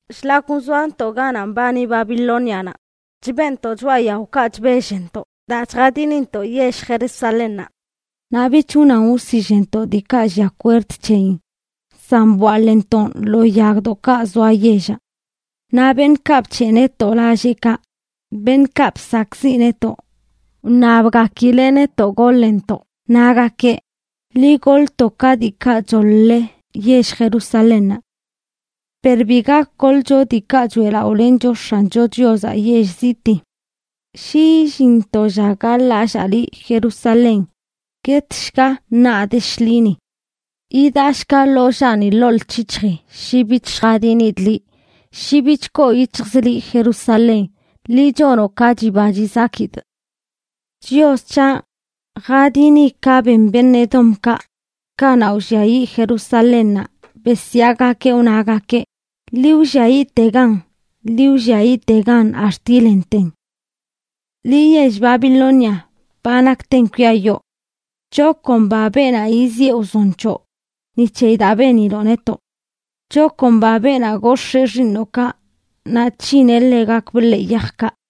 Shlak wzoantoꞌ ganaꞌ mbani Babilónianaꞌ chbeꞌntoꞌ choꞌa yaokaꞌ chbellntoꞌ daa chjadinintoꞌ yell Jerusalénnaꞌ. Naꞌ bich wnan wsillntoꞌ diikaꞌ lliaꞌ kwerd c̱heyin, san bwaḻꞌntoꞌn lo yagdoꞌkaꞌ zoa yellaꞌ. Naꞌ beṉꞌkaꞌ bc̱heꞌ netoꞌ lalleꞌkaꞌ, beṉꞌkaꞌ bsakꞌziꞌ netoꞌ, wṉabgakileꞌ netoꞌ goḻntoꞌ, nagakeꞌ: “Ḻi goḻto ka diikaꞌ choḻ-le yell Jerusalénnaꞌ.” Per bi gak goḻcho diikaꞌ choeꞌlaꞌolencho X̱ancho Chiozaꞌ yell zitii. Shi illin to lla gaḻ-lallaa liꞌ, Jerusalén, guetshga naꞌ de shḻini. Yidaꞌshga ḻollaani ḻoo lc̱hic̱hjii shi bich lljadinidꞌ liꞌ, shi bich koo yic̱hjzꞌ liꞌ, Jerusalén, liꞌ chonoꞌ ka chiba chizakidꞌ. Chios c̱haꞌ, jadini ka ben beṉꞌ Edomkaꞌ, kanaꞌ wlliayiꞌ yell Jerusalénnaꞌ, besyaagakeꞌ wnagakeꞌ: “¡Ḻi wlliayiꞌtegan! ¡Ḻi wlliayiꞌtegan ax̱t yilenten!” Liꞌ, yell Babilonia, ba nakten kwiayoo. ¡Chakomba beenaꞌ yiziꞌe wzon c̱hoꞌ ni c̱heyi daa beniloꞌ netoꞌ! ¡Chakomba beenaꞌ gox̱ee xiiṉoꞌkaꞌ naꞌ c̱hineꞌ ḻegakbꞌ ḻee yajkaꞌ!